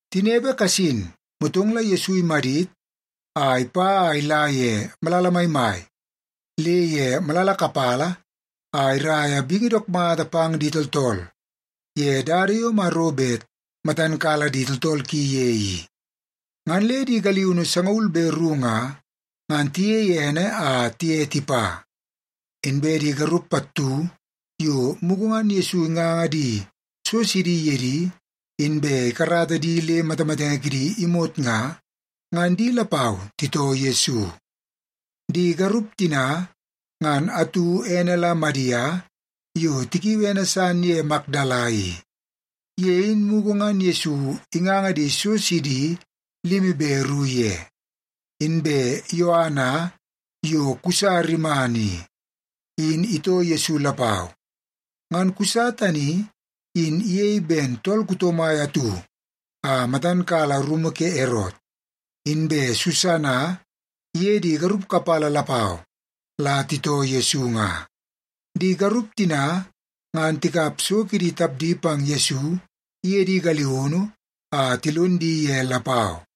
Tinepe kasin, motong la Yesu imadit a ipa a ila ye malala maimai le ye malala kapala a iraia bingi dook mata pang di tooltool ye dada yo Maro bet matan kala di tooltool ki ye i. Ngan le di galiunu sangaul be ru nga, ngan tiyei ene a tiye tipa. Inbe di garup pattu yo mugu ngan Yesu inganga di so sidi ye di inbe ikarata di le matamatenge kidi imot nga, ngan di lapau titoo Yesu. Di garup tina ngan atu ene la Madia yo tikiui ene san ye Makdala i. Ye in mugu ngan Yesu inganga di so sidi limi be ru ye. Inbe Yoana yo Kusa rimana i, in itoo Yesu lapau. Ngan Kusa tani in iyei ben tool kuto mai atu a matan kala rumu ke Erot. Inbe Susana iye di garup kapala lapau la titoo Yesu nga. Di garup tina ngan tikap so kidi tapdi pang Yesu iye di galiunu a tilon di ye lapau.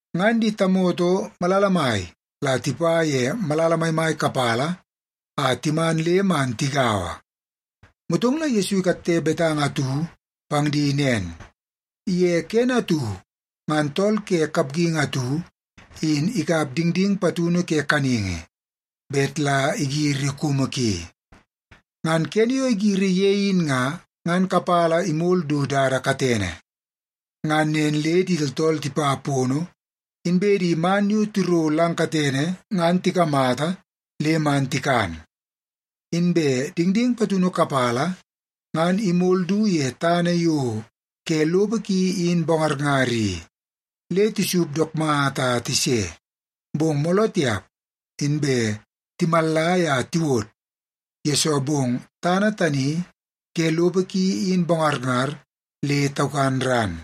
Ngan di tamoto malala mai la tipa ye malala maimai kapala a timan le man tigaua. Motong la Yesu ikatte betanga atu pang di nen, “Ye kene atu ngan tool ke kapgingi atu in ikap dingding patunu ke kaningi bet la igiri kumu ki. Ngan kene yo igiri ye in nga, ngan kapala imol du dada katene. Ngan nen le di tooltool tipa pono, inbe di man yo tiro lang katene ngan tikamata le man tikan. Inbe dingding patunu kapala ngan imol du ye tana yo ke lopo ki in bongarngar i, le tisup dook mata a tise, bong mooloo tiap inbe timallai a tiwod, yesoo bong tana tani ke lopo ki in bongarngar le taukan ran.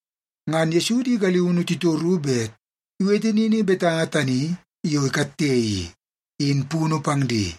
Ngan Yesu di galiunu titoru bet iwete nini betanga tani yo ikatte i, in punu pang di.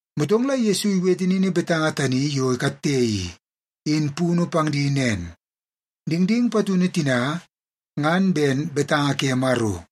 Motong la Yesu iwete nini betanga tani yo ikatte i, in punu pang di nen, “Dingding patunu tina, ngan ben betanga ke Maro.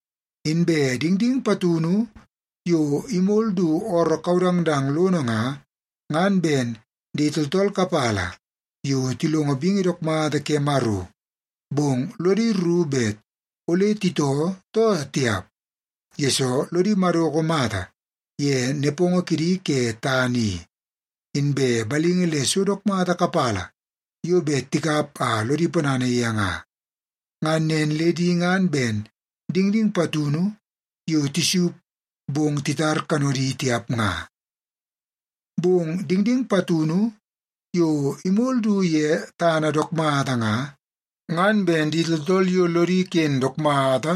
Inbe dingding patunu yo imol du ooroo kaudangdang lono nga, ngan ben di tooltool kapala yo tilongo bingi dook mata ke Maro. Bong lodi rru bet ole titoo too tiap, yesoo lodi madoko mata ye nepongo kidi ke tana i, inbe balingi le so dook mata kapala yo bet tikap a lodi ponana ye nga. Ngan nen le di ngan ben dingding patunu yo tisup bong titar kanodi tiap nga. Bong dingding patunu yo imol du ye tana dook mata nga, ngan ben di tooltool yo lodi ken dook mata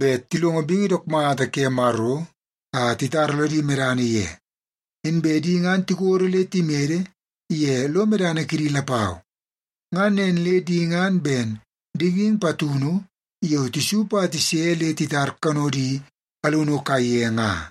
bet tilongo bingi dook mata ke Maro a titara lodi medana ye. Inbe di ngan tikodo le timede ye lo medana kidi lapau. Ngan nen le di ngan ben dingding patunu yo tisup a tise le titar kanodi alunu kaiye nga.”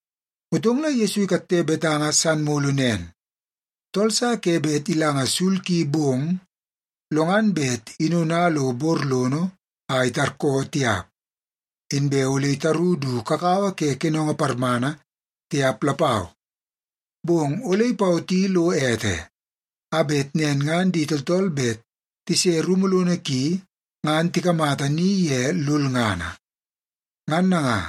Motong la Yesu ikatte betanga san mulu nen, “Tool sa ke bet ilanga sul ki bong, lo ngan bet inona lo bor lono a itarkoo tiap. Inbe ole itaru du kakawa ke kenongo parmana, tiap lapau. Bong ole ipawoti lo ete, a bet nen ngan di tooltool bet tise rumu lono ki ngan tikamata ni ye lulngana. Ngan nanga,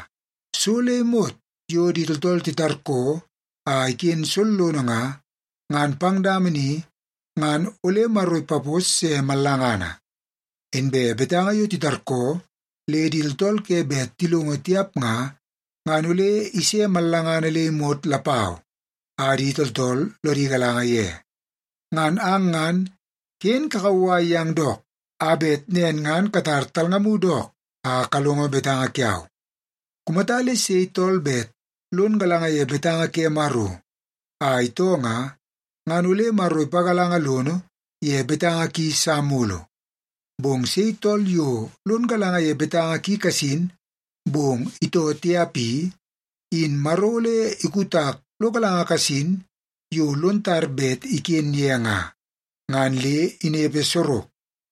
so le imot yo di tooltool titarkoo a iken sollono nga, ngan pang dama ni ngan ole Maro ipapos se mallangana. Inbe betanga yo titarkoo le di tooltool ke bet tilongo tiap nga, ngan ole ise mallangana le imot lapau a di tooltool lodi galanga ye. Ngan ang ngan ken kakauwai yang dook a bet nen ngan katar talngamu dook a kalongo betanga kiau. Kumata le sei tool bet lon galanga ye betanga ke Maro a itoo nga, ngan ole Maro ipagalanga lono ye betanga ki sa mulu. Bong sei tool yo lon galanga ye betanga ki kasin, bong itoo tiap i, in Maro ole ikutak lo galanga kasin yo lon tar bet iken ye nga, ngan le inepe sorok.”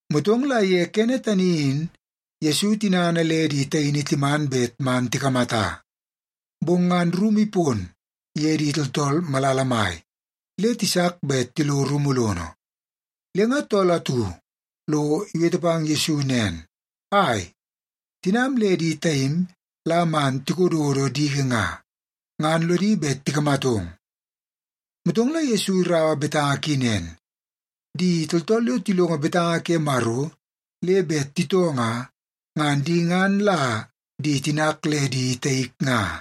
Motong la ye kene tani in Yesu tinana le di taini timan bet man tikamata. Bong ngan rumu ipon ye di tooltool malala mai, le tisak bet tilo rumu lono. Le nga tool atu lo iwete pang Yesu nen, “Ai, tinam le di taim la man tikododo diki nga, ngan lodi bet tikamatong.” Motong la Yesu iraua betanga ki nen, “Di tooltool yo tilongo betanga ke Maro le bet titoo nga, ngan di ngan la di tinak le di taik nga.”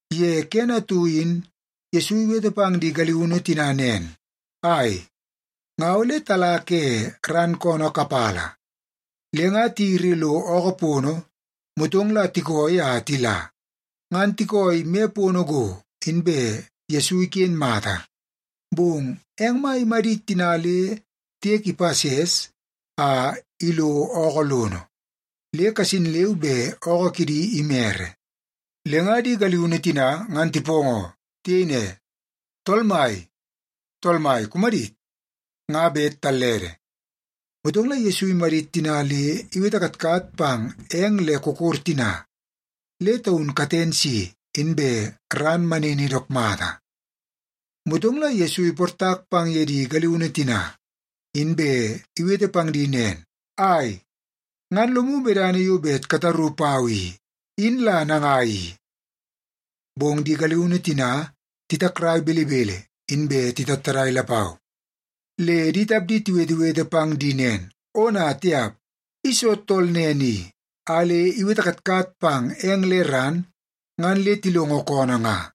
Ye kene atu in Yesu iwete pang di galiunu tina nen, “Ai, nga ole tala ke ran koonoo kapala.” Le nga tiyiri lo ookoo pono, motong la tikooi a tila. Ngan tikooi me pono go, inbe Yesu iken mata. Bong eng mai imadit tina le tiek ipases a ilo ookoo lono, le kasin leu be ookoo kidi imere. Le nga di galiunu tina ngan tipoongoo. Tiyei ne, “Tool mai, tool mai, kumadit! Nga bet tallede!” Motong la Yesu imadit tina le iwete katkat pang eng le kokor tina, le taun katen si, inbe ran manini dook mata. Motong la Yesu iportak pang ye di galiunu tina, inbe iwete pang di nen, “Ai, ngan lomu medana yo bet kataru pau i, in la nangai i?” Bong di galiunu tina titakrai belebele, inbe tatattadai lapau, le di tapdi tiwetewete pang di nen, “Ona tiap! I soo tool nen i a le iwete katkat pang eng le ran ngan le tilongo koonoo nga?”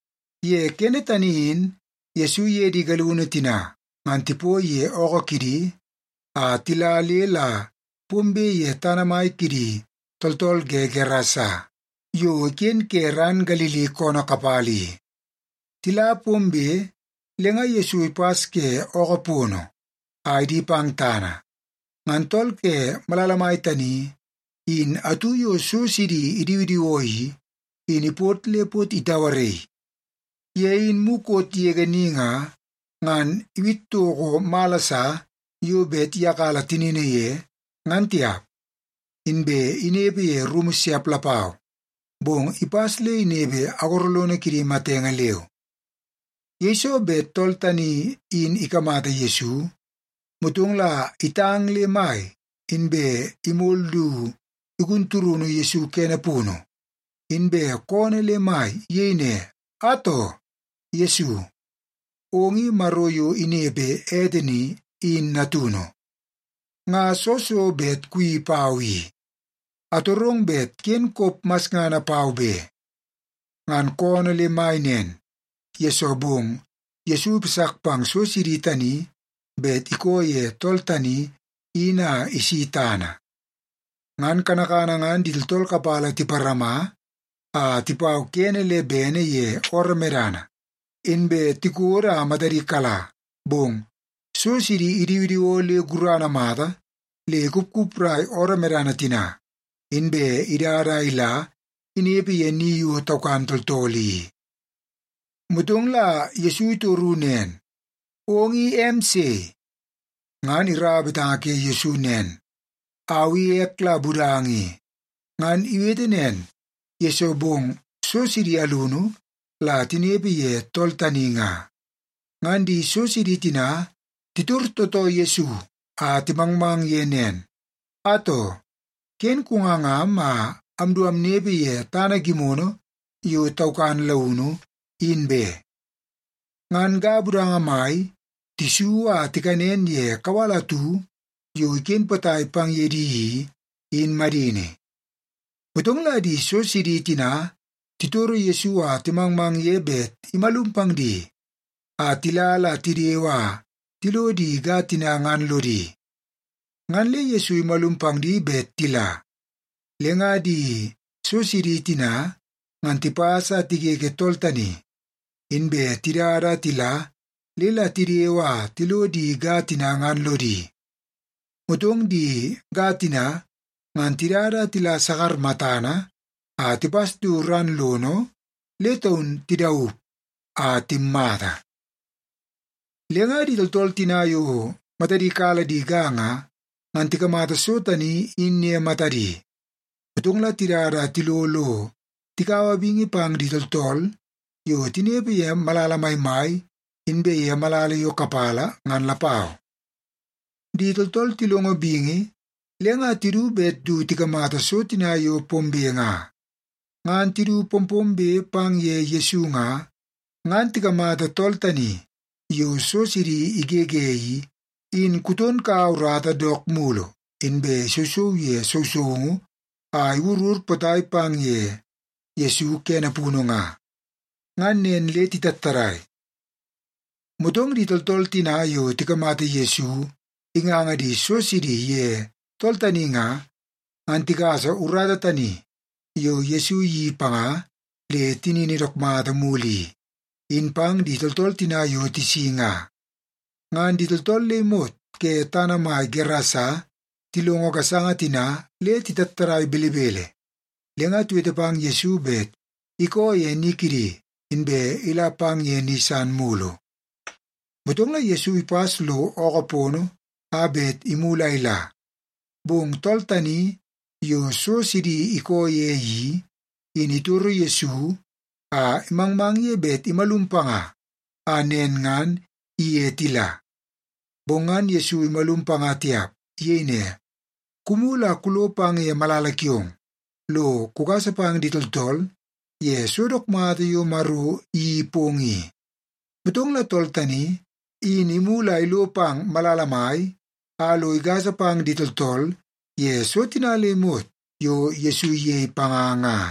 Ye kene tani in Yesu iye di galiunu tina ngan tipoi ye ookoo kidi a tila le la pombe ye tana mai kidi tooltool ke Gerasa yo iken ke ran Galili koonoo kapala i. Tila pombe, le nga Yesu ipas ke ookoo pono a idi pang tana, ngan tool ke malala mai tani in atu yo so sidi idiwidiwoo i, in ipot le pot itauaraii. Ye in mukot yege ni nga, ngan iwit toko mala sa yo bet iyakala tinini ye, ngan tiap. Inbe inepe ye rumu siap lapau, bong ipas le inepe agoro lono kidi matenge leu. Yeiso bet tool tani in ikamata Yesu, motong la itang le mai, inbe imol du igun turunu Yesu kene punu, inbe koonoo le mai. Iyei ne, “Atoo! Yesu, ong i Maro yo inepe ete ni, in natunu. Nga soo so bet kuyeii pau i? Atorong bet ken kop masngana pau be!” Ngan koonoo le mai nen, yesoo bong Yesu ipasak pang so sidi tani bet ikoo ye tool tani in a isi tana. Ngan kanakana ngan di tooltool kapala tiparama a tipau kene le bene ye ooroo medana, inbe tikodo a matadi kala. Bong so sidi idiwidiwoo le gurana mata le ikupkuprai ooroo medana tina, inbe idada a ila inepe ye ni yo taukan tooltool i. Motong la Yesu itoru nen, “Ong i em sei?” Ngan iraua betanga ke Yesu nen, “Au i ek la Budanga i.” Ngan iwete nen, yesoo bong so sidi alunu la tinepe ye tool tani nga. Ngan di so sidi tina titor tootoo Yesu a timangmang ye nen, “Atoo, ken kungangam a amdu amnepe ye tana gimono yo taukan launu, in be.” Ngan ga budanga mai tisu a tikanen ye kawal atu yo iken potai pang ye di i, in madini. Motong la di so sidi tina titoro Yesu a timangmang ye bet imalum pang di a tila la tidewe a tilo di ga tina ngan lodi. Ngan le Yesu imalum pang di bet tila. Le nga di so sidi tina ngan tipas a tigege tool tani, inbe tidada a tila le la tidewe a tilo di ga tina ngan lodi. Motong di ga tina ngan tidada a tila sakar matana a tipas du ran lono le taun tidaup a timmata. Le nga di tooltool tina yo matadi kala di ga nga, ngan tikamata so tani in ye matadi. Motong la tidada a tilo lo tikaua bingi pang di tooltool yo tinepe ye malala maimai inbe ye malala yo kapala ngan lapau. Di tooltool tilongo bingi, le nga tidu bet du tikamata so tina yo pombe nga. Ngan tidu pompombe pang ye Yesu nga, ngan tikamata tool tani yo so sidi igege i, in kuton kaua urata dook mulu, inbe isousou ye sousoungu a iwurur potai pang ye Yesu kene punu nga. Ngan nen le titattadai. Motong di tooltool tina yo tikamata Yesu inganga di so sidi ye tool tani nga, ngan tigasa urata tani yo Yesu iyeii panga le tinini dook mata mulu i, in pang di tooltool tina yo tisi nga. Ngan di tooltool le imot ke tana mai Gerasa tilongo gasanga tina le titattadai belebele, le nga tiwete pang Yesu bet ikoo ye ni kidi, inbe ila pang ye ni san mulu. Motong la Yesu ipas lo ookoo pono a bet imulu a ila. Bong tool tani yo so sidi ikoo ye i, in itoro Yesu a imangmang ye bet imalum panga a nen ngan iye tila. Bong ngan Yesu imalum panga tiap. Iyei ne, “Kumulu a kulo pang ye malala kiong, lo kugasa pang di tooltool ye so dook mata yo Maro iyeii pong i.” Motong la tool tani, in imulu a ilo pang malala mai a lo igasa pang di tooltool ye so tina le imot yo Yesu iyei panga nga.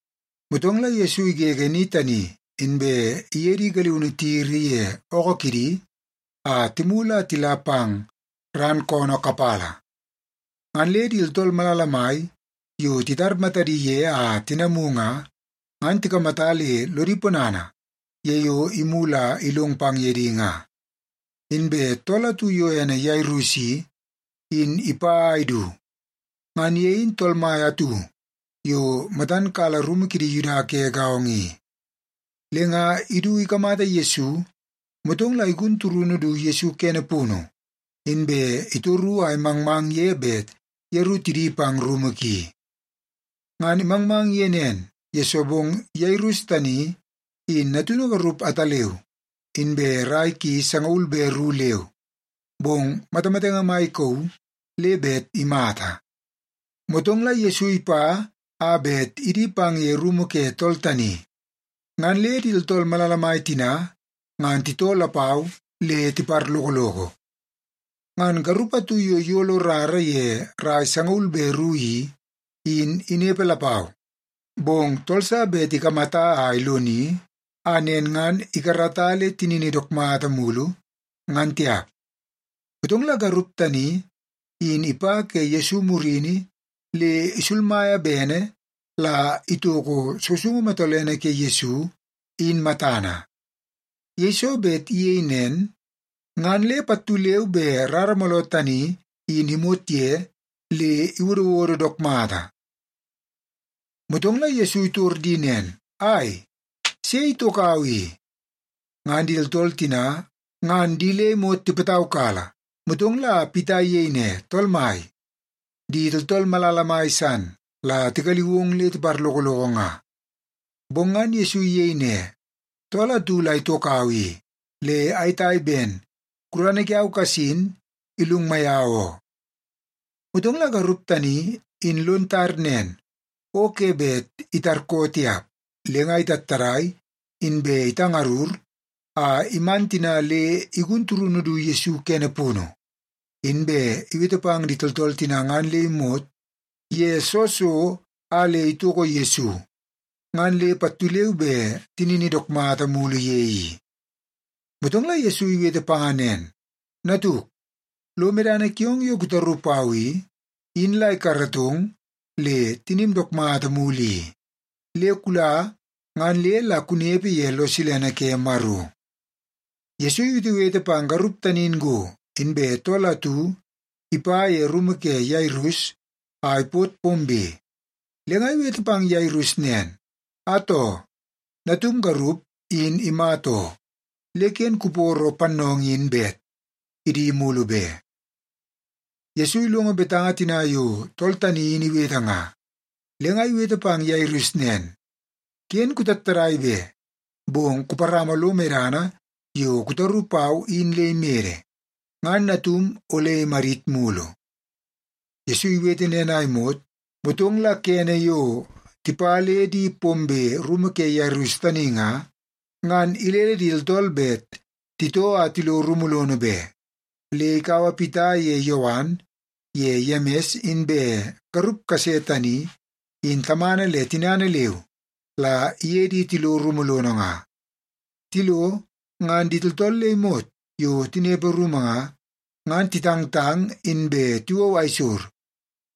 Motong la Yesu igege ni tani, inbe iye di galiunu tiyiri ye ookoo kidi a timulu a tila pang ran koonoo kapala. Ngan le di tooltool malala mai yo titar matadi ye a tinamu nga, ngan tikamata le lodi ponana ye yo imulu a ilong pang ye di nga. Inbe tool atu yo ene Yairus i, in ipa a idu. Ngan ye in tool mai atu yo matan kala rumu kidi Yuda ke gaongo i. Le nga idu ikamata Yesu, motong la igun turunu du Yesu kene punu, inbe itoru a imangmang ye bet yeru tidi pang rumu ki. Ngan imangmang ye nen, yesoo bong Yairus tani in natunu garup ataleu, inbe rai ki sangaul be ru leu, bong matamatenge mai ikauu le bet imata. Motong la Yesu ipa a bet idi pang ye rumu ke tool tani, ngan le di tooltool malala mai tina ngan titoo lapau le tiparlokoloko. Ngan garup atu yo iyolo rara ye rai sangaul be ru i, in inepe lapau. Bong tool sa bet ikamata a iloni, a nen ngan ikarata le tinini dook mata mulu, ngan tiap. Motong la garup tani in ipa ke Yesu murini le isulmaia bene la itoko sousoungu matolene ke Yesu, in matana. Yeiso bet iyei nen, ngan le pattu leu be rara mooloo tani in imot ye le iwodowodo dook mata. Motong la Yesu itor di nen, “Ai, sei itokau i?” Ngan di tooltool tina ngan di le imot tipataukala, motong la Pita iyei ne, “Tool mai, di tooltool malala mai san la tigaliu ong le tiparlokoloko nga.” Bong ngan Yesu iyei ne, “Tool atu la itokau i, le ayetai ben gurana kiau kasin ilungmai au oo.” Motong la garup tani in lon tar nen o ke bet itarkoo tiap. Le nga itattadai, inbe itangarur a iman tina le igun turunu du Yesu kene punu, inbe iwete pang di tooltool tina ngan le imot ye soo so a le itoko Yesu, ngan le pattu leu be tinini dook mata mulu ye i. Motong la Yesu iwete panga nen, “Natuk, lo medana kiong yo kutaru pau i, in la ikaratong le tinim dook mata mulu i. Le kula ngan le la kunepe ye lo silene ke Maro.” Yesu iwetewete pang garup tani in go, inbe tool atu ipa ye rumu ke Yairus a ipot pombe. Le nga iwete pang Yairus nen, “Atoo, natum garup in imata oo. Le ken kuporo pannoongoo in bet idi mulu be.” Yesu ilongo betanga tina yo tool tani in iwete nga, le nga iwete pang Yairus nen, “Ken kutattadai be, bong kuparama lo medana yo kutaru pau in le imede, ngan natum ole imadit mulu.” Yesu iwete nen a imot, motong la kene yo tipa le di pombe rumu ke Yairus tani nga, ngan ilele di tooltool bet titoo a tilo rumu lono be. Le ikaua Pita ye Yowan ye Yemis inbe garup kase tani in tamana le tinana leu, la iye di tilo rumu lono nga. Tilo ngan di tooltool le imot yo tinepe rumu nga, ngan titangtang inbe tiwou aisor.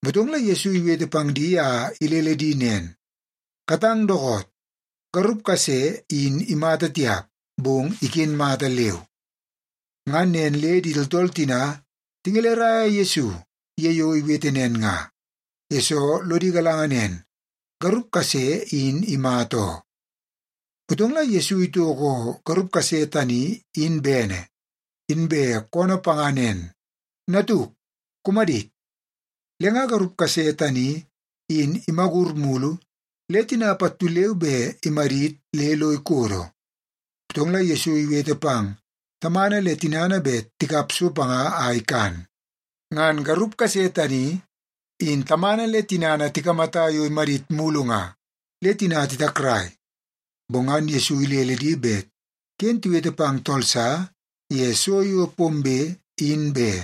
Motong la Yesu iwete pang di a ilele di nen, “Katang dookoot! Garup kase in imata tiap, bong iken mata leu.” Ngan nen le di tooltool tina tingeleraia Yesu ye yo iwete nen nga, yesoo lodi galanga nen, garup kase in imata oo. Motong la Yesu itoko garup kase tani in bene, inbe koonoo panga nen, “Natuk, kumadit.” Le nga garup kase tani in imagur mulu le tina pattu leu be imadit le lo ikodo. Motong la Yesu iwete pang tamana le tinana bet tikap so panga a ikan. Ngan garup kase tani in tamana le tinana tikamata yo imadit mulu nga, le tina titakrai. Bong ngan Yesu ilele di bet ken tiwete pang tool sa ye so yo pombe, in be.